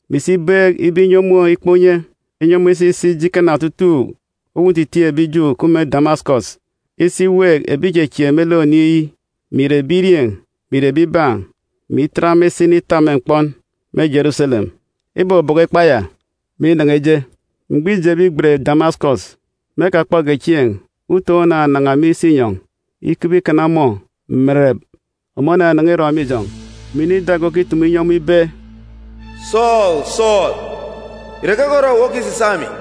mè isi ibeek ibe inyi ọmọ ikpa unye, inyi ọmọ isa isi ije ikana otutuuk uwu ntitiin̄ ebi Ju òkup me Damasikọs isi iweek ebi ìchechieek me lek Oniin̄ yi, mè ìre ebirieen̄ mè ìre ebibaan̄, mè itet ema isa initap me mkpọn me Jeruselem. Ibọbọkọ ikpa ya, mè inan̄a ije. Mgbọ îjebe igbet Damasikọs, me ekakpọge chieen̄, utoon̄ onanan̄a me isinyọn̄ ikebe ikana ọmọ mèrèrèp. Ọmọ onanan̄a irọn̄ me ijọn̄, mè inọ ida ge okitumu inyi ọmọ ibe, “Sọọlu, Sọọlu, ìre keke orọ owu okisisaak emi?”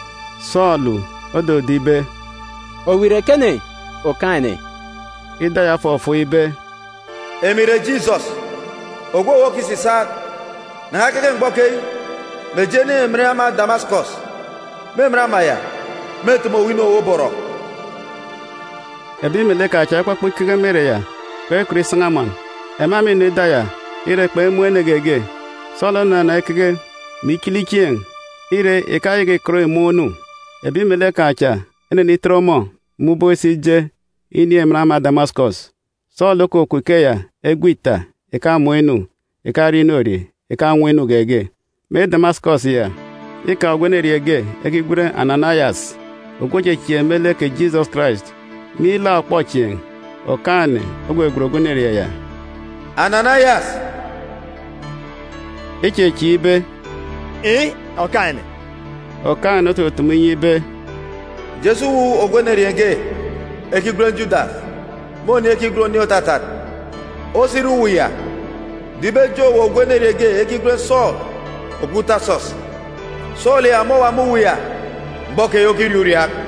Sọọlu ododo ibe, “Owu ìre ekene, Okaan̄-ene?” Ida ya ofọfọọk ibe, “Emi ìre Jisọs, ogwu owu okisisaak. Nan̄a keke mgbọ keyi, mè je nin̄ emen ama Damasikọs. Me emen ama ya, mêteme owu inu owu oborọ.” Ebi melek kan̄ cha ekpọkpọ ikeke me ere ya, kpekọt isan̄a amọn. Ema mînọ ida ya, ire, kpemun̄ ene geege. Sọọlu onanan̄a ikeke, mè ichili chieen̄. Ire, ìkayaka ìkọt ìmọọn̄ inu. Ebi melek kan̄ cha enenitet ọmọ me ubọk isa ije inin̄ emen ama Damasikọs. Sọọlu okukup ikeya egwe ita, ìkamọọn̄ inu, ìkarie inorie, ìkanwọ inu geege. Me Damasikọs ya, îkaan̄ ogwu enerieen̄ ge ekigwen Ananayas, ogwu òchechieek me lek kè Jisọs Karais. Me ilaak ọkpọchieen̄, Okaan̄-ene ogwegwen ogwu enerieen̄ ya, “Ananayas!” Ichechieek ibe, “Iin̄, Okaan̄-ene.” Okaan̄-ene otutumu inyi ibe, “Je si uwu ogwu enerieen̄ ge ekigwen Judas, me oniin̄ ekigwen Oniin̄ Òtatat. Osire uwu ya, do ibe ejeen̄ owu ogwu enerieen̄ ge ekigwen Sọọlu ogwu Tasọs. Sọọlu ya ọmọ òwa me uwu ya mgbọ keyi okiriaak uriaak.”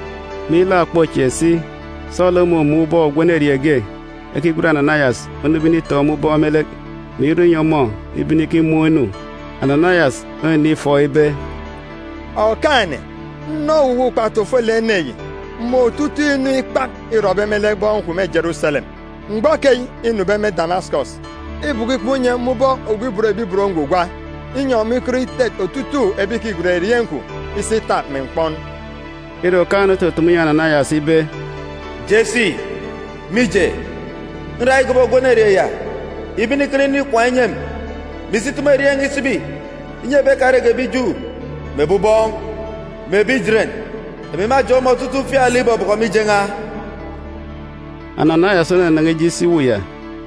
Me ilaak ọkpọchieen̄ si, Sọọlu omumun̄ ubọk ogwu enerieen̄ ge ekigwen Ananayas onube initoon̄ ọmọ ubọk me lek, mè irọ inyi ọmọ ibene ikimọọn̄ inu. Ananayas onenifọọk ibe, “Okaan̄-ene, nnọ owuwa ukpatu ofolek ene yi, mè otutuuk inu ikpak îrọbe me lek bọn kwun̄ me Jeruselem. Mgbọ keyi înube me Damasikọs, îbọkọ ikpa unye me ubọk ogwu òban Awaji, inyi ọmọ ikọt itet otutuuk ebi ìkigwen erieen̄ kwun̄ isi itap me mkpọn.” Ire, Okaan̄-ene otutumu inyi Ananayas ibe, “Je si, mije, nra igobo ogwu enerieen̄ ya ibe inikana nroon̄ ikwaan̄ inyi emi, mè isi itumu erieen̄ n̄a isibi inyi ebi ekarege ebi Ju, mè ebi ubọọn̄, mè ebi Ijeren. Emi mâjeen̄ ọmọ otutuuk ufialek ìbobọkọ mije n̄a.” Ananayas onanan̄a ije isi uwu ya,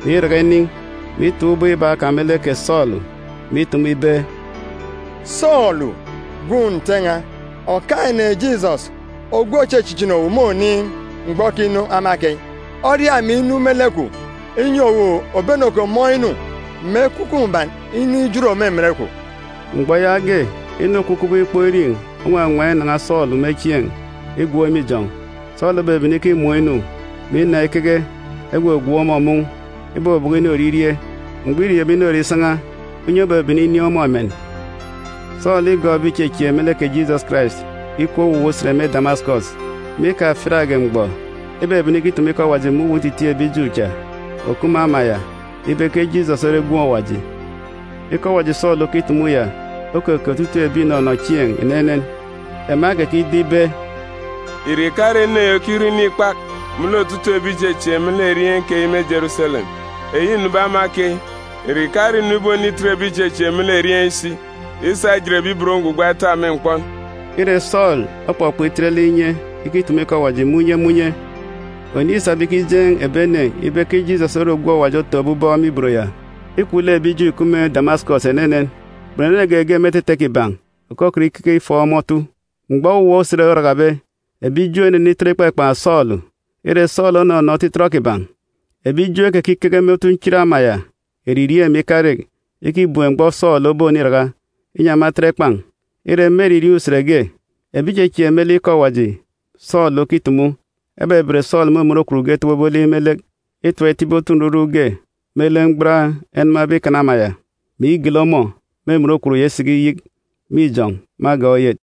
mè iraka inin̄, mè itoon̄ ubọk iba kan̄ me lek kè Sọọlu, mè itumu ibe, “Sọọlu, gwun̄ Nte n̄a, Okaan̄-ene Jisọs ogwu òchichichini owu me oniin̄ mgbọ okinu ama keyi, oria emi inu me lek kwun̄, inyi owu òbene òkomọọn̄ inu, mè Ekwukwu Mbuban inin̄ ijot me emen kwun̄.” Mgbọ yaage, inu òkup kubọk ikpọk irin̄ owawaan̄ inan̄a Sọọlu me chieen̄ igwook me ijọn̄. Sọọlu obebene ikimọọn̄ inu, mè inan̄a ikeke. Egwogwook ọmọ mun̄. Ibọbọkọ inorie irie. Mgbọ îriebe inorie isan̄a, unye obebene inin̄ ọmọ emen. Sọọlu îtumu ikọ Awaji me Damasikọs Sọọlu îgọọk ebi ìchechieek me lek kè Jisọs Karais ikup owuwa usen me Damasikọs. Me ikafiatge mgbọ, ibebene ikitumu ikọ Awaji me uwu ntitiin̄ ebi Ju cha òkup me ama ya ibe ke Jisọs ore Gwun̄ Awaji. Ikọ Awaji Sọọlu okitumu ya okeke otutuuk ebi ìnọnọ chieen̄ enenen. Ema ekekido ibe, “Ìre ìkare ene yi okirọ inu ikpak me lek otutuuk ebi ìchechieek me lek erieen̄ keyi me Jeruselem? Eyi înube ama keyi, ìre ìkare ìnu ibonitet ebi ìchechieek me lek erieen̄ yi si isa ijet ebi ibot ngwugwa etap me mkpọn?” Ire, Sọọlu okpọkpọ itet lek inye ikitumu ikọ Awaji me unye me unye. Oniin̄ îsabe ikijeen̄ ebi ene ibe ke Jisọs ore ogwu Awaji otọkọbe aran̄ me ibot ya îkwu lek ebi Ju ìkup me Damasikọs enenen. Kpunu ene geege me etete kiban̄ òkọkọt ikeke ifọọk ọmọ otu. Mgbọ owuwa usen orakabe, ebi Ju enenitọt ikpakpan̄ Sọọlu. Ire, Sọọlu onọnọ otitọt kiban̄. Ebi Ju ekekikeke me otunchit ama ya eririeen̄ mè ikarek ikibem mgbọ Sọọlu oboniraka, inyi ema etet ekpan̄. Ire, me eririeen̄ usen ge, ebi ìchechieek me lek ikọ Awaji Sọọlu okitumu, ebeben Sọọlu me emen okwun ge etobobe olik me lek itap itibi otu nruruk ge me lek mgban enamabe ikana ama ya, mè igele ọmọ me emen okwun ya isiki iyik me ijọn̄ me agan̄ oyet.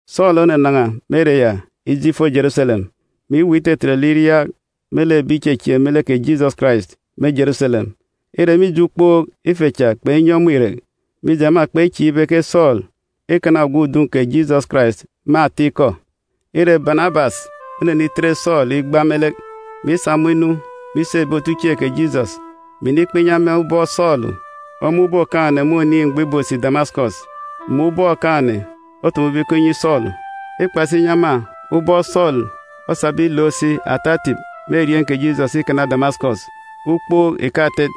Sọọlu onanan̄a me ere ya ije ifo Jeruselem, mè iweek itetet lek iriaak me lek ebi ìchechieek me lek kè Jisọs Karais me Jeruselem. Ire, mije ukpook, ife cha kpenyi ọmọ irek, mije, ema kpechieek ibe ke Sọọlu îkana ogwu udun̄ kè Jisọs Karais me atikọ. Ire, Banabas onenitet Sọọlu igba lek, mè isa ọmọ inu me isi ebi otuchieen̄ kè Jisọs, mè inikpa inyi ema ubọk Sọọlu omun̄be Okaan̄-ene me oniin̄ mgbọ ìbosi Damasikọs, mè ubọk Okaan̄-ene otumube ikọ inyi Sọọlu. Îkpa si inyi ema ubọk Sọọlu osabe ilook si ata etip me erieen̄ kè Jisọs ikana Damasikọs, ukpook ìkatet.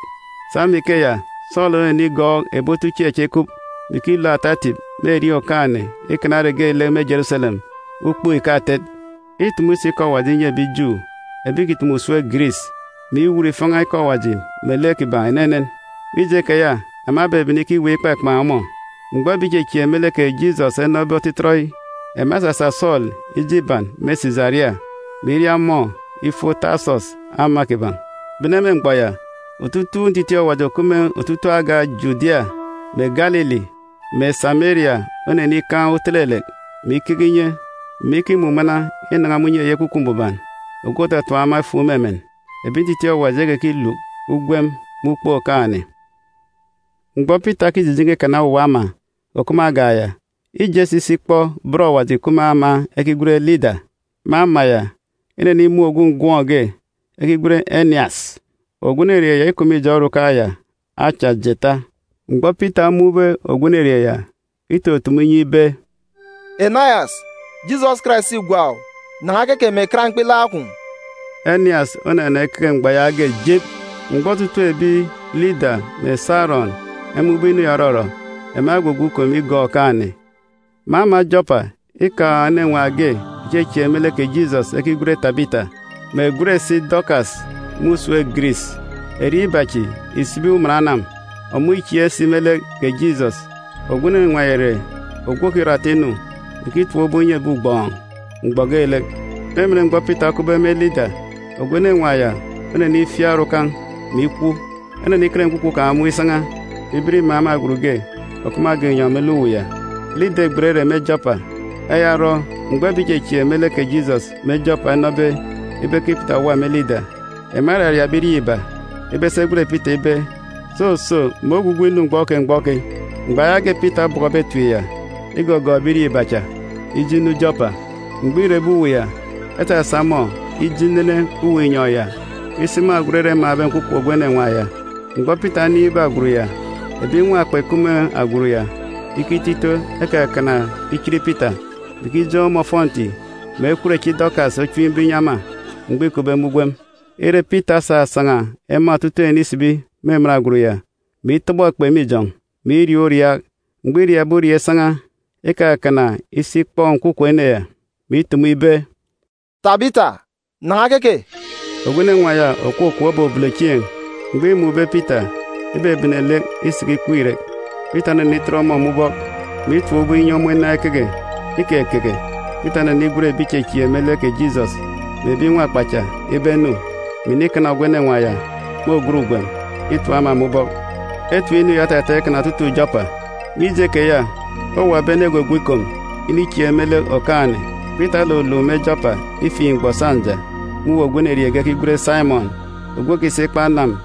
Sa me ikeya, Sọọlu onenigọọk ebi otuchieen̄ cha ikup, mè ikilook ata etip me erieen̄ Okaan̄-ene ikana ere geelek me Jeruselem, ukpook ìkatet. Îtumu si ikọ Awaji inyi ebi Ju ebi ìkitumu usem Giris, mè iwut ifan̄a ikọ Awaji melek kiban̄ enenen. Mije keya, ema ebebene ikiweek ikpakpan̄ ọmọ. Mgbọ ebi ìchechieek me lek kè Jisọs enọbe otitọt yi, ema esasa Sọọlu ije iban me Sisaria, mè iria ọmọ ifo Tasọs ama kiban̄. Bene me mgbọ ya, otutuuk ntitiin̄ Awaji òkup me otutuuk agan̄ Judia, mè Galili, mè Sameria onenikaan̄ utelelek, mè ikeke inye, mè ikimumana inan̄a me unye eyi Ekwukwu Mbuban ogwu òtatap ema efuuk me emen. Ebi ntitiin̄ Awaji ekekiluk ugwem me ukpook Okaan̄-ene. Mgbọ Pita okijijen̄e ikana owuwa ama òkup me agan̄ ya, îje si isi ikpọ bọn Awaji ìkup me ama ekigwen Lida. Me ama ya, inenimun̄ ogwu ngọm ge ekigwen Enias. Ogwu enerieen̄ ya îkup me ijọn̄ orukan̄ ya acha jeeta. Mgbọ Pita omun̄be ogwu enerieen̄ ya, itutumu inyi ibe, “Enias, Jisọs Karais îgwa owu! Nan̄a keke, mè kat mkpilaak kwun̄!” Enias onanan̄a ikeke mgbọ yaage jîp. Mgbọ otutuuk ebi Lida mè Sarọn emun̄be inu ya òrọrọ, ema egwugwu ikom igọọk Okaan̄-ene. Me ama Jọpa, îkaan̄ enenwaan̄ ge òchechieek me lek kè Jisọs, ekigwen Tabita, mè ègwen si Dọkas me usem Giris. (Erieen̄ iba cha ìsibi “uman anam.”) Ogwu enenwaan̄ ya ìre ogwu òkirọ ata inu, mè ikitap ubọk inyi ebi ugbọọn̄ mgbọ geelek. Me emen mgbọ Pita okupbe me Lida, ogwu enenwaan̄ ya onenifiak orukan̄, mè ikwu. Eneniken nkwukwu kan̄ mun̄ isan̄a, mè iben imaan̄ me agwut ge òkup me agan̄ inyọn̄ me lek uwu ya. Lida îgbet ere me Jọpa. Eya orọ, mgbọ ebi ìchechieek me lek kè Jisọs me Jọpa enọbe ibe ke Pita òwa me Lida, ema eraria ebirieen̄ iba ibe esi egwen Pita ibe, soso, mè ogwugwu inu mgbọ keyi mgbọ keyi. Mgbọ yaage Pita obọkọbe etip ya, igọgọọk ebirieen̄ iba cha ije inu Jọpa. Mgbọ îrebe uwu ya, esasa ọmọ ije inene uwu inyọn̄ ya isi me agwut ere emaan̄be nkwukwu ogwu enenwaan̄ ya. Mgbọ Pita onin̄be agwut ya, ebi nwakpa ìkup me agwut ya ikito ito ekakana ichit Pita, mè ikijeen̄ ọmọ ofọnti, mè ekwut echi Dọkas ochimbe inyi ema mgbọ îkupbe me ugwem. Ire, Pita osasan̄a ema otutuuk ene isibi me emen agwut ya, mè itọbọ ekpe me ijọn̄, mè iriaak uriaak. Mgbọ îriaakbe uriaak isan̄a, ikakana isi ikpọ nkwukwu ene ya, mè itumu ibe, “Tabita, nan̄a keke!” Ogwu enenwaan̄ ya òkwukwu obobolo chieen̄. Mgbọ îmun̄be Pita, ibebene lek isiki ikweek irek. Pita onenitet ọmọ me ubọk, mè itap ubọk inyi ọmọ inan̄a ikeke. Ikekeke. Pita onenigwen ebi ìchechieek me lek kè Jisọs mè ebi nwakpa cha ibe enu, mè inikana ogwu enenwaan̄ ya me ògat ugwem itap ema me ubọk. Etip inu ya otataan̄ ikana otutuuk Jọpa. Mije keya, owuwa ebi ene egwugwu ikom inichieek me lek Okaan̄-ene. Pita oluluk me Jọpa ifiin̄ mgbọ sọnja me uwu ogwu enerieen̄ ge ekigwen Saimọn, ogwu ikwaan̄ ikpa anam.